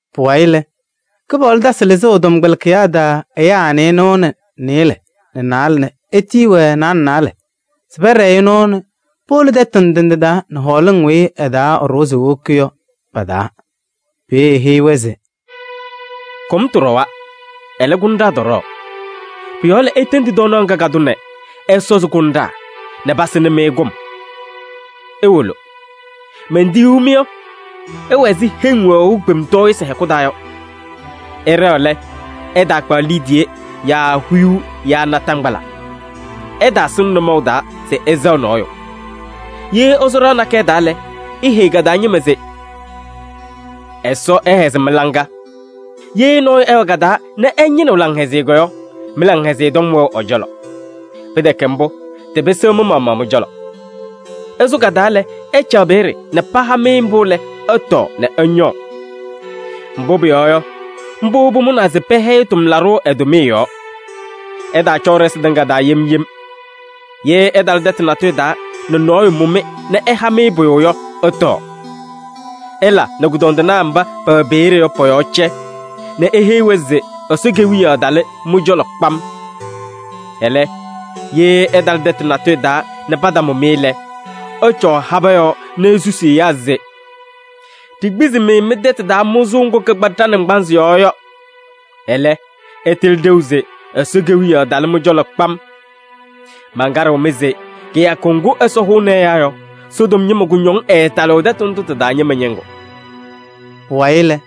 Pʋwayɩ lɛ, Kɩpaɣlʋ tasɩ lɩzʋʋ ɛ-tɔmkpɛlɩkɩyaa taa ɛyaa nɩɩnʋwa nɛ nɩɩlɛ nɛ naalɛ nɛ etiyi-wɛ naalɛ naalɛ se pɛɖɛɛ-ɩ nɔɔ nɛ powolo tɛtʋ ndɩ ndɩ nɛ hɔɔlɩŋ weyi ɩ-taa ɛɖʋwa se ewoki yɔ pa-taa. Peeye eheyi-wɛ se: “Kʋmtʋ ɖɔwa, ɛlɛ, kʋnɖaa tɔɖɔɔ. Pʋ-yɔɔ lɛ, itendi tɔɔnaɣ ŋga ka-tʋ nɛ ɛsɔzɩ kʋnɖaa nɛ pasɩnɩ-mɩ kʋm. Iwolo. Mentiyuu-mɩ yɔ, ɩwɛ ɛzɩ heŋ wɛɣʋ kpemtɔɔyɩsɩ hɛkʋ taa yɔ. Ɩɖɛɣ lɛ, ɩtaakpaɣ liidiye yaa huyuu yaa naataŋgbala. Ɩtaasɩŋ nʋmɔʋ taa se ɩsɛɣ nɔɔyʋ. Ye ɩsʋ ɖɩɣa nakɛyɛ taa lɛ, iheyi ka-taa ñɩma se: ‘Ɛsɔ ɛhɛzɩ mɩ-laŋa.’ Ye nɔɔyʋ ɛwɛ ka-taa nɛ ɛñɩnɩɣ laŋhɛzɩyɛ yɔ, mɩ-laŋhɛzɩyɛ tɔm wɛɣ ɛ-cɔlɔ. Pɩtɛkɛ mbʋ, tɩpɩsɩɣ mɩ-maɣmaɣ mɩ-cɔlɔ. Ɩsʋ ka-taa lɛ, ɩcaɣ peeye nɛ paha-mɩ mbʋ lɛ, ɩtɔɔ nɛ ɩñɔɔ. Mbʋ pʋyɔɔ yɔ, mbʋ pʋmʋnaa se pɛhɛyɩ tʋmlaɖʋ ɛ-tʋmɩyɛ yɔɔ. Ɩtaacɔɔ ɖɩsɩ tɩŋa taa yem yem. Ye ɩtalɩ tɛtʋ natʋyʋ taa nɛ nɔɔyʋ mʋ-mɩ nɛ ɛha-mɩ pʋyʋ yɔ, ɩtɔɔ. Ɩla nɛ kʋdɔndɩnaa mba pɛwɛ peeye yɔ pɔ-yɔɔ cɛ nɛ iheyi-wɛ se Ɛsɔ Kewiyaɣ talɩ mɩ-cɔlɔ kpam. Ɛlɛ, ye ɩtalɩ tɛtʋ natʋyʋ taa nɛ patamʋ-mɩ lɛ, ɩcɔɔ habɛɛ yɔɔ nɛ isusi ɛyaa se: ‘Ɖikpizi-mɩ mɩ-tɛtʋ taa mʋzʋʋ ŋgʋ kɩkpa ɖa-naŋgbanzɩ yɔɔ yɔ. Ɛlɛ, ɩtɩlɩ ɖeu se Ɛsɔ Kewiyaɣ talɩ-mɩ cɔlɔ kpam.’ Mankaɖɩɣ-mɩ se kɩyakʋ ŋgʋ Ɛsɔ hʋʋnɩ ɛyaa yɔ, Sodom ñɩma kʋñɔŋ ɛɛtalɩɣ tɛtʋ ndʋ tɩ-taa ñɩma ñɩŋgʋ.” Pʋwayɩ lɛ,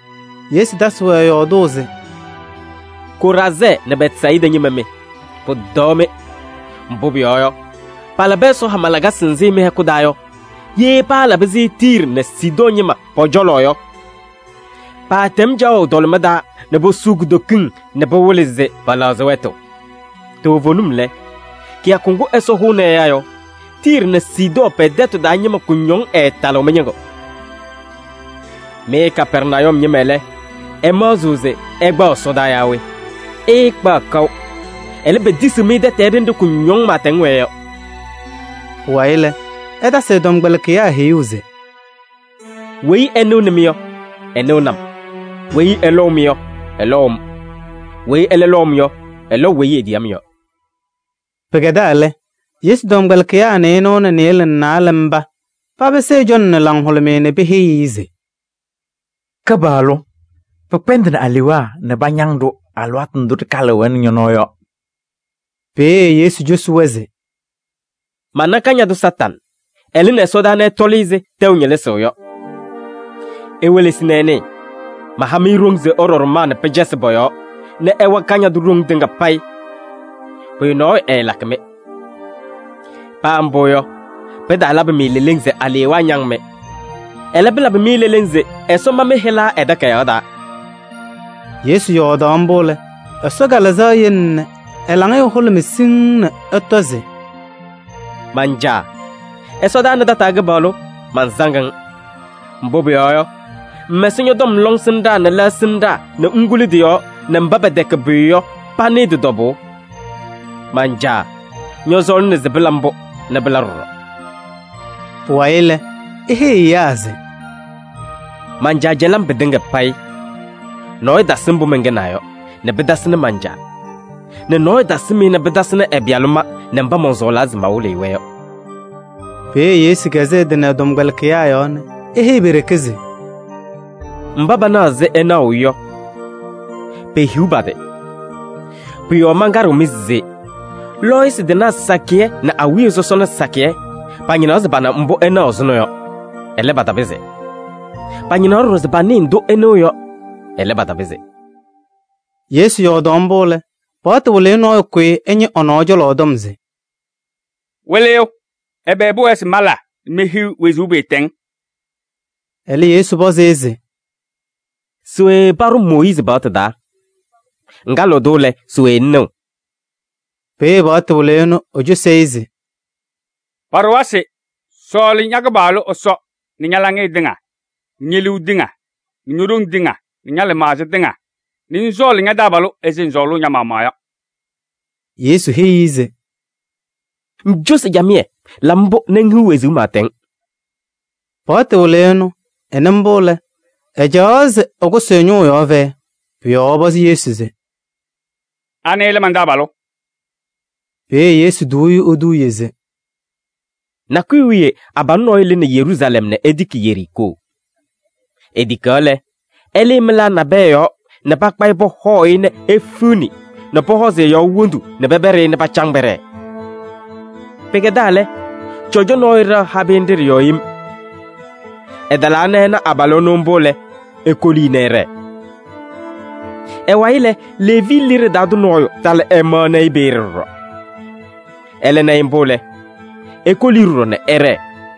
Yesu tasɩ yɔɔdʋʋ se: “Koraazɛɛ nɛ Bɛtsayɩda ñɩma mɩ! Pʋtɔɔ-mɩ! Mbʋ pʋyɔɔ yɔ, palabɩ Ɛsɔ hama lakasɩ nzɩ mɩ-hɛkʋ taa yɔ, ye paalabɩ-sɩ Tiiri nɛ Sidɔɔ ñɩma pɔ-cɔlɔ yɔ, paatɛm caɣʋ tɔlɩma taa nɛ posuu kutokiŋ nɛ pɩwɩlɩ se pɛlɛɣzɩ wɛtʋ. Toovenim lɛ, kɩyakʋ ŋgʋ Ɛsɔ hʋʋnɩ ɛyaa yɔ, Tiiri nɛ Sidɔɔ pɛ-tɛtʋ taa ñɩma kʋñɔŋ ɛɛtalɩɣ mɩ-ñɩŋgʋ. Mɩ Kapɛrnayum ñɩma lɛ, ɩmaɣzɩɣ se ɩkpaɣ ɛsɔdaa yaa we? Ɩɩkpaɣ kaʋ. Ɛlɛ, petisiɣ-mɩ tɛtɛɛ ɖenɖe kʋñɔŋ pɩɩtɛŋ wɛɛ yɔ.” Pʋwayɩ lɛ, ɛtasɩ ɛ-tɔmkpɛlɩkɩyaa heyuu se: “Weyi ɛnɩɣnɩ-mɩ yɔ, ɛnɩɣnɩ-m. Weyi ɛlɔʋ-mɩ yɔ, ɛlɔʋ-m. Weyi ɛlɛ lɔʋ-m yɔ, ɛlɔʋ weyi etiyi-m yɔ.” Pɩkɛdaa lɛ, Yesu tɔmkpɛlɩkɩyaa nɩɩnʋwa nɛ nɩɩlɛ nɛ naalɛ mba papɩsɩ ɛ-cɔlɔ nɛ laŋhʋlʋmɩyɛ nɛ peheyi-i se: “Kɩpaɣlʋ! Pɩkpɛndɩnɩ alewaa nɛ pañaŋ-ɖʋ alɩwaatʋ ndʋ ɖɩkalɩɣ-wɛ nɛ ñɔ-nɔɔ yɔ.” Peeye Yesu cosi-wɛ se: “Mana Kañadʋ Satanɩ, ɛlɩnɩ ɛsɔdaa nɛ ɛtɔlɩ ɛzɩ tɛʋ ñɩlɩzʋʋ yɔ. Iwelesi nɛ ɩnɩɩ, maha-mɩ ɖoŋ se ɩɖɔ ɖʋmaa nɛ pɩcasɩ pɔ-yɔɔ nɛ ɩwa Kañadʋ ɖoŋ tɩŋa payɩ. Pʋyʋ nɔɔyʋ ɛɛlakɩ-mɩ. Paa mbʋ yɔ, pɩtaalabɩ-mɩ leleŋ se alewaa ñaŋ-mɩ. Ɛlɛ, pɩlabɩ-mɩ leleŋ se Ɛsɔ ma mɩ-hɩla ɛ-takayaɣ taa.” Yesu yɔɔdaɣ mbʋ lɛ, Ɛsɔ Kalɩzaɣ yele nɛ ɛ-laŋɩyɛ hʋlʋmɩ siŋŋ nɛ ɛtɔ se: “Man-Caa! Ɛsɔdaa nɛ tataa Kɩpaɣlʋ! Mansaŋ-ŋ. Mbʋ pʋyɔɔ yɔ, ŋmɛsɩ ñɔ-tɔm lɔŋsɩnɖaa nɛ lɛɣsɩnɖaa nɛ ŋkuli tɩ-yɔɔ nɛ mba pɛtɛkɛ pʋyʋ yɔ panɩɩ tɩ-tɔbʋʋ. Man-Caa! Ñɔsɔɔlɩna se pɩla mbʋ nɛ pɩla ɖɔɖɔ.” Pʋwayɩ lɛ, eheyi ɛyaa se: “Man-Caa cɛlɩ-m pɩtɩŋa payɩ. Nɔɔyʋ tasɩ mbʋ mɛnkɛnaa yɔ nɛ pɩtasɩnɩ man-Caa nɛ nɔɔyʋ tasɩm-ɩ nɛ pɩtasɩnɩ ɛ-Pɩyalʋ ma nɛ mba mɔnsɔɔlaa se mawɩlɩ-ɩ-wɛ yɔ.” Peeye Yesu kɛzɩ ɛ-tɩ nɛ ɛ-tɔmkpɛlɩkɩyaa yɔɔ nɛ eheyi pe-ɖeke se: “Mba panaɣ ɛzɩ ɩnaɣʋ yɔ, pehiɣ pa-tɩ! Pʋ-yɔɔ mankaɖɩɣ-mɩ se: lɔɔyɩsɩ tɩnaa sakɩyɛ nɛ awiya sɔsɔna sakɩyɛ pañɩnaɣ se pana mbʋ ɩnaɣ ɛzʋnɔ yɔ. Ɛlɛ, patapɩzɩ. Pañɩnaɣ ɖɔɖɔ se panɩɩ ndʋ ɩnɩɣ yɔ. Ɛlɛ, patapɩzɩ.” Yesu yɔɔdaɣ mbʋ lɛ, paɣtʋ wɩlɩyʋ nɔɔyʋ kʋyɩ ɛñɩ ɛ-nɔɔ cɔlɔ tɔm se: “Wɩlɩyʋ! Ɛbɛ pʋwɛɛ se mala nɛ mehiɣ wezuu pɩɩtɛŋ?” Ɛlɛ Yesu pɔzɩ-ɩ se: “Se we paɖʋ Mooyiizi paɣtʋ taa? Ŋkalɩɣ-tʋ lɛ, se we ŋnɩɣ?” Peeye paɣtʋ wɩlɩyʋ ɛnʋ ecosi-i se: “Paɖʋwa se: sɔɔlɩ ña-Kɩpaɣlʋ Ɛsɔ nɛ ña-laŋɩyɛ tɩŋa nɛ ñe-liu tɩŋa nɛ ño-ɖoŋ tɩŋa nɛ ña-lɩmaɣza tɩŋa nɛ ŋsɔɔlɩ ña-taabalʋ ɛzɩ ŋsɔɔlʋʋ ña-maɣmaɣ yɔ.” Yesu heyi-i se: “Ŋcosi camɩyɛ, la mbʋ nɛ ŋhiɣ wezuu pɩɩtɛŋ.” Paɣtʋ wɩlɩyʋ ɛnʋ ɛnɩ mbʋ lɛ, ɛcaɣ se ɛkʋsɩ ɛ-ñʋʋ yɔɔ fɛyɛ. Pʋ-yɔɔ ɛpɔzɩ Yesu se: “Anɩ lɛ man-taabalʋ?” Peeye Yesu tuu-i eduuye se: “Nakʋyʋ wiye abalʋ nɔɔyʋ lɩnɩ Yeruusalɛm nɛ etiki Yeriikoo. Etikaɣ lɛ, ɛlɩɩ mɩlaa nabɛyɛ yɔɔ nɛ pakpa-ɩ pɔhɔɔ-ɩ nɛ efiɣni nɛ pɔhɔzɩ ɛ-yɔɔ wondu nɛ pɛpɛɖɩ-ɩ nɛ pacaŋ pɛɖɛɛ. Pɩkɛdaa lɛ, cɔjɔ nɔɔyʋ ɖɛɣ habɩyɛ nɖɩ ɖɩ-yɔɔ yem. Ɛtalaa nɛ ɛna abalʋ ɛnʋ mbʋ lɛ, ekoli-i nɛ ɛɖɛɛ. Ɛ-wayɩ lɛ, Leevi liɖe taa tʋ nɔɔyʋ talɩ ɛmaɣnɩ-ɩ peeye ɖɔɖɔ. Ɛlɛ na-ɩ mbʋ lɛ, ekoli-i ɖɔɖɔ nɛ ɛɖɛɛ.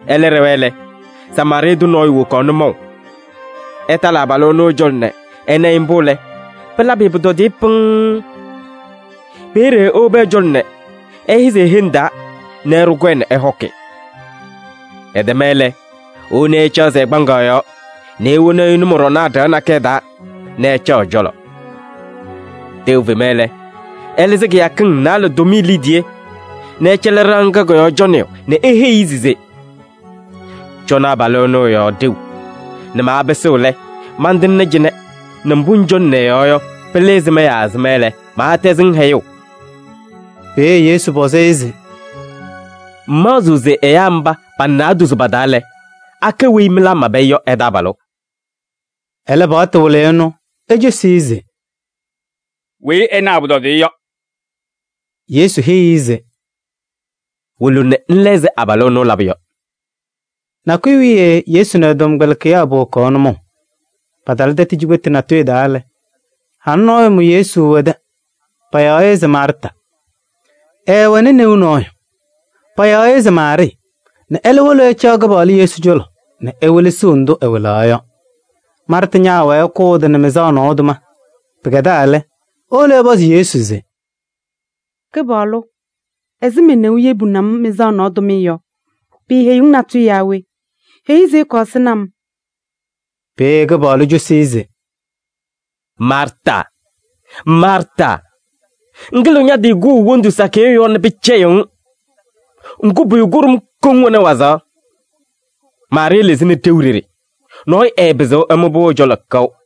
Ɛlɛ ɖɛwa lɛ, Samaarɩɩ tʋ nɔɔyʋ wokaɣ nʋmɔʋ. Ɛtalɩ abalʋ ɛnʋ ɛ-cɔlɔ nɛ ɛna-ɩ mbʋ lɛ, pɩlabɩ-ɩ pʋtɔdɩyɛ pɩŋŋ. Peeye ewobi ɛ-cɔlɔ nɛ ɛhɛzɩ e-heŋ taa nɛ ɛɖʋ kɔyɛ nɛ ɛhɔkɩ. Ɛtɛma lɛ, ewoni-i ɛcaɣzɩ ɛ-kpaŋaɣ yɔɔ nɛ ewoni-i nʋmɔɖɔnaa ɖɩɣa nakɛyɛ taa nɛ ɛcaɣ ɛ-cɔlɔ. Tɛʋ fema lɛ, ɛlɩzɩ kɩyakɩŋ naalɛ tʋmɩyɛ liidiye nɛ ɛcɛlɩ ɖɩɣa ŋga kɔ-yɔɔ cɔnɩyʋ nɛ eheyi-i se: ‘Cɔnɩ abalʋ ɛnɛ ɛ-yɔɔ ɖeu nɛ maapɩsɩɣ lɛ, mantɩŋnɩ cɩnɛ nɛ mbʋ ŋcɔnɩnɩ ɛ-yɔɔ yɔ, pɩlɩ ɛzɩma yaa ɛzɩma lɛ, maatɛzɩ-ŋ hɛyʋʋ.’” Peeye Yesu pɔzɩ-ɩ se: “Ŋmaɣzɩɣ se ɛyaa mba pa-naadozo pa-taa lɛ, akɛ weyi mɩlaa mabɩ-ɩ yɔ ɛ-taabalʋ?” Ɛlɛ Paɣtʋ wɩlɩyʋ ɛnʋ ecosi-i se: “Weyi ɛna ɛ-pʋtɔdɩyɛ yɔ.” Yesu heyi-i se: “Wolo nɛ ŋla ɛzɩ abalʋ ɛnʋ ɛlabʋ yɔ.” Nakʋyʋ wiye Yesu nɛ ɛ-tɔmkpɛlɩkɩyaa powokaɣ nʋmɔʋ. Patalɩ tɛtʋ cikpetu natʋyʋ taa lɛ, halʋ nɔɔyʋ mʋ Yesu ɛ-tɛ, payaɣ-ɩ se Maarta Ɛɛwɛnɩ neu nɔɔyʋ, payaɣ-ɩ se Maarɩɩ nɛ ɛlɛ wolo ɛcaɣ Kɩpaɣlʋ Yesu cɔlɔ nɛ ewelesiɣ ndʋ ɛwɩlaɣ yɔ. Maarta ñaawɛɛ ɛkʋʋ ɛ-tɩ nɛ mɩzaɣ nɔɔ tʋma. Pɩkɛdaa lɛ, ewolo ɛpɔzɩ Yesu se: “Kɩpaɣlʋ, ɛzɩ me-neu yebuni-m mɩzaɣ nɔɔ tʋmɩyɛ yɔ, piiheyiɣ-ŋ natʋyʋ yaa we? Heyi-i se ɛkɔɔ ɛsɩnɩ-m.” Peeye Kɩpaɣlʋ cosi-i se: “Maarta! Maarta! Ŋkɩlɩɣ ña-tɩ kʋʋ wondu sakɩyɛ yɔɔ nɛ pɩcɛyɩɣ-ŋ. Ŋgʋ, pʋyʋ kʋɖʋm koŋ wɛnɩ wazaɣ. Maarɩɩ lɩzɩnɩ ɖeu ɖeɖe. Nɔɔyʋ ɛɛpɩzɩɣ ɛmʋ-pʋ ɛ-cɔlɔ kaʋ.”